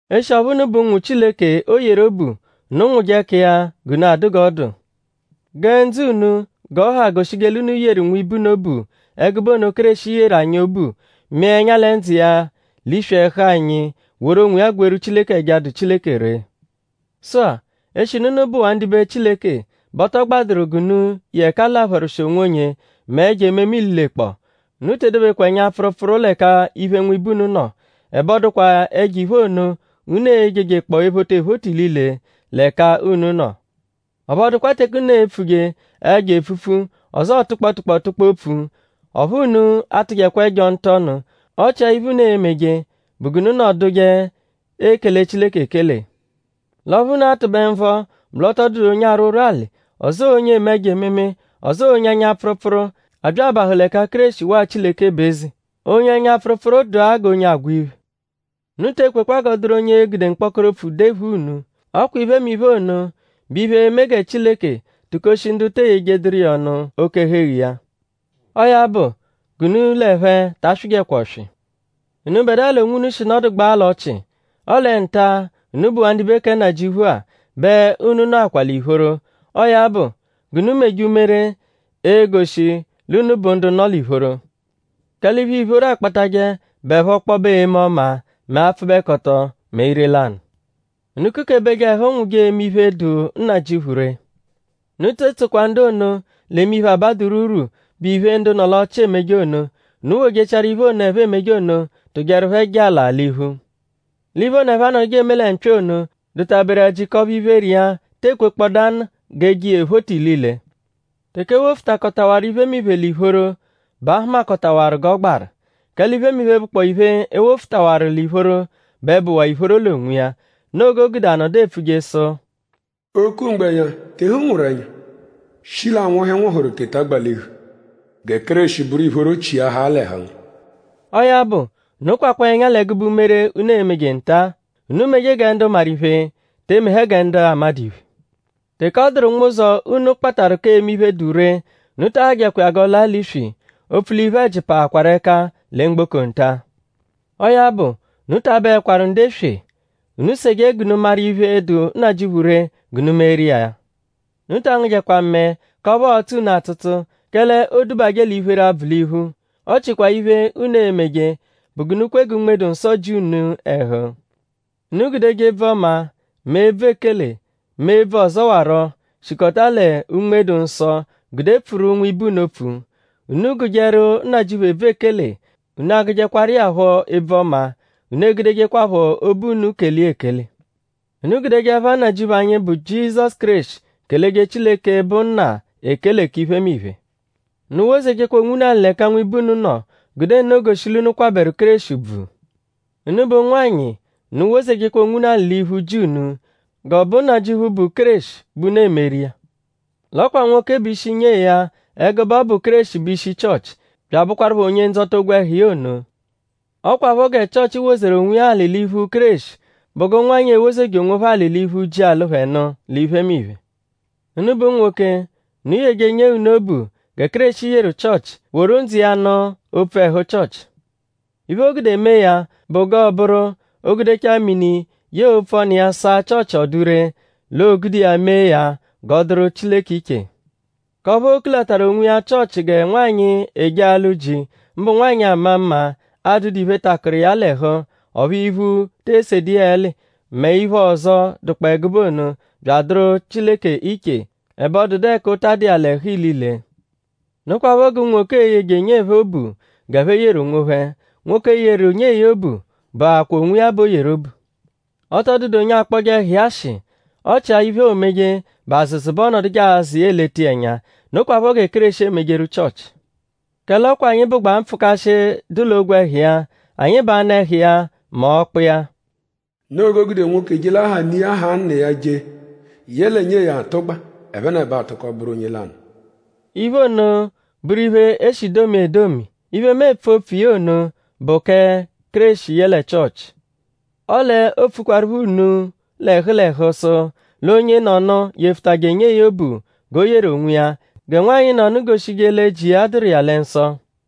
Eshi ọphu unu bụ ụnwu Chileke, o yeru obu; unu nwụje ẹka iya g'unu adụ g'ọ dụ. Gẹ ndzụ unu g'ọ ha goshije l'unu yeru nwibe unu obu ẹgube ono, Kéreshi yeru anyi obu; mịa ẹnya lẹ ndzụ iya l'iswi ẹhu anyi; woru onwiya gweeru Chileke ẹja, dụ Chileke ree. Sụ-a; eshinu unu bụwaa ndibe Chileke bẹ ọ tọ gbadụru g'unu ye ẹka l'apharwụshi onwonye mẹ ẹjo ememe ililekpọo. Unu te edobekwa ẹnya-pfụrupfuru l'ẹka iphe nwibe unu nọ; ẹbe ọ dụkwa ẹjo-iphe ono, unu e-jejekpọ ephota ephota ilile l'ẹka unu nọ. Ọphu ọ dụkwa teke unu e-pfuje ẹjo epfupfu; ọzoo tụkpo tụkpo tụkpo opfu; ọphu unu atujekwa ẹjo ntụ-ọnu. Ọ chia iphe, unu e-meje bụ g'unu nọduje ekele Chileke ekele. L'ọphu unu a-tụbe nvọ bụ l'ọ tọ dụdu onye arwụ ụrwuali; ọzoo onye eme ẹjo ememe; ọzoo onye ẹnya-pfụrupfuru, abya abahụ l'ẹka Kéreshi waa Chileke bụ eze. Onye ẹnya-pfụrupfuru dụa g'onye agwa iphe. Unu te ekwekwa g'ọ dụru onye e-gude mkpọkoro opfu dephua unu. Ọ kwa iphemiphe ono bụ iphe, e-me gẹ Chileke tukoshi ndu te eyejeduru iya ọnu oke-ẹhu-eghu iya. Ọo ya bụ; g'unu l'ẹphe ta swịjekwa ọswi. Unubẹdua l'onwunu shi nọdugbaa l'ọchii; ọle nta-a, unu bụwaa ndibe kẹ Nnajịuphu-a bẹ unu nọakwaa l'ìphóró. Ọo ya bụ g'unu meje umere, e-goshi l'unu bụ ndu nọ l'ìphóró. Kẹle iphe, ìphóró akpatajẹ bụepho ọkpobe eme ọma; mẹ apfụbekoto; mẹ ire-lanụ. Unu kukebeje ẹhu nwụje eme iphe, dụ Nnajịuphu ree. Unu te etsokwa ndu ono, l'eme iphe, abadụru urwu, bụ iphe, ndu nọ l'ọchii emeje ono. Unu wojechiaru iphe ono, ẹphe emeje ono tụjeru phẹ jalaa l'iphu. L'iphe ono, ẹphe anọduje eme lẹ mpya ono dụta-beru ẹji k'ọphu iphere iya te ekwekpọdanu g'e je iya ephota ilile. Teke e wofutakọtawaru iphemiphe l'ìphóró bẹ a hụmakotawaru g'ọ gbaru; kẹle iphemiphe, bụkpoo iphe, e wofutawaru l'ìphóró bẹ bụwaa ìphóró l'onwiya. Noo g'o gude a nọdu epfuje sụ: “O-ku-mgbẹnya; tehu nwụru ẹnya! Shi l'anwụhu, ị nwụhuru teta gbalihu! Gẹ Kéreshi bụru ìphóró chiahaa l'ẹhu ngu.” Ọo ya bụ; unu kwakwaa ẹnya l'ẹgube umere, unu emeje nta. Unu meje gẹ ndu maru iphe; te emehẹ gẹ ndu amadụ iphe. Teke ọ dụru nwụzo, unu kpatarụ k'eme iphe, dụ ree; unu ta ahajẹkwa iya g'ọ laa l'iswi; opfu l'iphe-ẹji paakwaru ẹka lẹ mgboko nta. Ọo ya bụ; unu ta abụekwaru ndu eswe. Unu seje g'unu maru iphe, dụ Nnajịuphu ree g'unu meeru iya. Unu ta angụjekwa mẹe k'ọphu ọo-tsụ unu atsụtsu; kẹle oodubajẹ l'iphere abvụ l'iphu. Ọ chikwaa iphe, unu e-meje bụ g'unu kwe gẹ Unme-dụ-Nsọ ji unu ẹhu. Unu gudeje ebvu ọma; mẹ ebvu ekele; mẹ ebvu ọzowaro, shikọta lẹ Unme-dụ-Nsọ gude pfuru nwibe unu opfu. Unu gụjeru Nnajịuphu ebvu ekele; unu agụjekwaru iya phọ ebvu ọma. Unu egudejekwaphọ obu unu kele iya ekele. Unu gudeje ẹpha Nnajịuphu anyi, bụ Jizọsu Kéreshi keleje Chileke, bụ Nna ekele k'iphemiphe. Unu wozejekwa onwunu alị l'ẹka nwibe unu nọ; gude nno goshi l'unu kwabẹru Kéreshi ùbvù. Unubẹ ụnwanyi; unu wozejekwa onwunu alị l'iphu ji unu; g'ọ bụ Nnajịuphu, bụ Kéreshi bẹ unu emeru iya. L'ọ kwa nwoke bụ ishi nyee ya ẹgube ọ bụ Kéreshi bụ ishi Chịochi; bya abụkwarupho Onye-Ndzọta ogwẹhu iya ono. Ọ kwaphọ gẹ Chịochi wozeru onwiya alị l'iphu Kéreshi bụ g'ụnwanyi e-wozeje onwophẹ alị l'iphu ji, alụ phẹ nụ l'iphemiphe. Unubẹ unwoke, unu yeje nyee unu obu gẹ Kéreshi yeru Chịochi; woru ndzụ iya nụ opfu ẹhu Chịochi. Iphe, o gude mee ya bụ g'ọo-bụru: o -gudechaa mini yẹe opfu ọnu iya saa Chịochi ọ dụ ree; l'oogude iya mee ya g'ọ dụru Chileke iche; k'ọphu oo-kulataru onwiya Chịochi gẹ nwanyị, eje alụ ji; mbụ nwanyị ama mma, adụdu iphe, takụru iya l'ẹhu; ọphu iphu te esedu iya ẹli; mẹ iphe ọzo, dụkpoo ẹgube ono; bya adụru Chileke iche; ẹbe ọ dụdu ẹka ụta dụ iya l'ẹhu ilile. Nokwaphọ g'unwoke e-yeje nyee phẹ obu g'ẹphe yeru onwophẹ. Nwoke, yeru nyee ya obu bụakwaa onwiya b'o yeru obu. Ọ tọ dụdu onye akpọje ẹhu iya ashị. Ọ chia iphe, oomeje bụ àzụ̀zù bẹ ọonoduje azụ iya; eleta iya ẹnya. Nokwaphọ gẹ Kéreshi emejeru Chịochi. Kẹle ọ kwa anyi bụgbaa mpfụkashi, dụ l'ogwẹhu iya. Anyi bụ anụ-ẹhu iya mẹ ọkpu iya. “Noo g'o gude nwoke je l'aha ne iya; haa nna iya je; yẹle nyee ya atụgba. Ẹphenebo atụko bụru onye lanụ.” Iphe ono bụru iphe, e shi domia edomi. Iphe, mu epfu opfu iya ono bụ kẹ Kéreshi yẹle Chịochi. Ọle oopfukwaruphọ unu l'ẹhu l'ẹhu; sụ l'onyenọnu yefutajẹ nyee ya obu g'o yeru onwiya; gẹ nwanyị nọnu goshije lẹ ji iya dụru iya lẹ nsọ.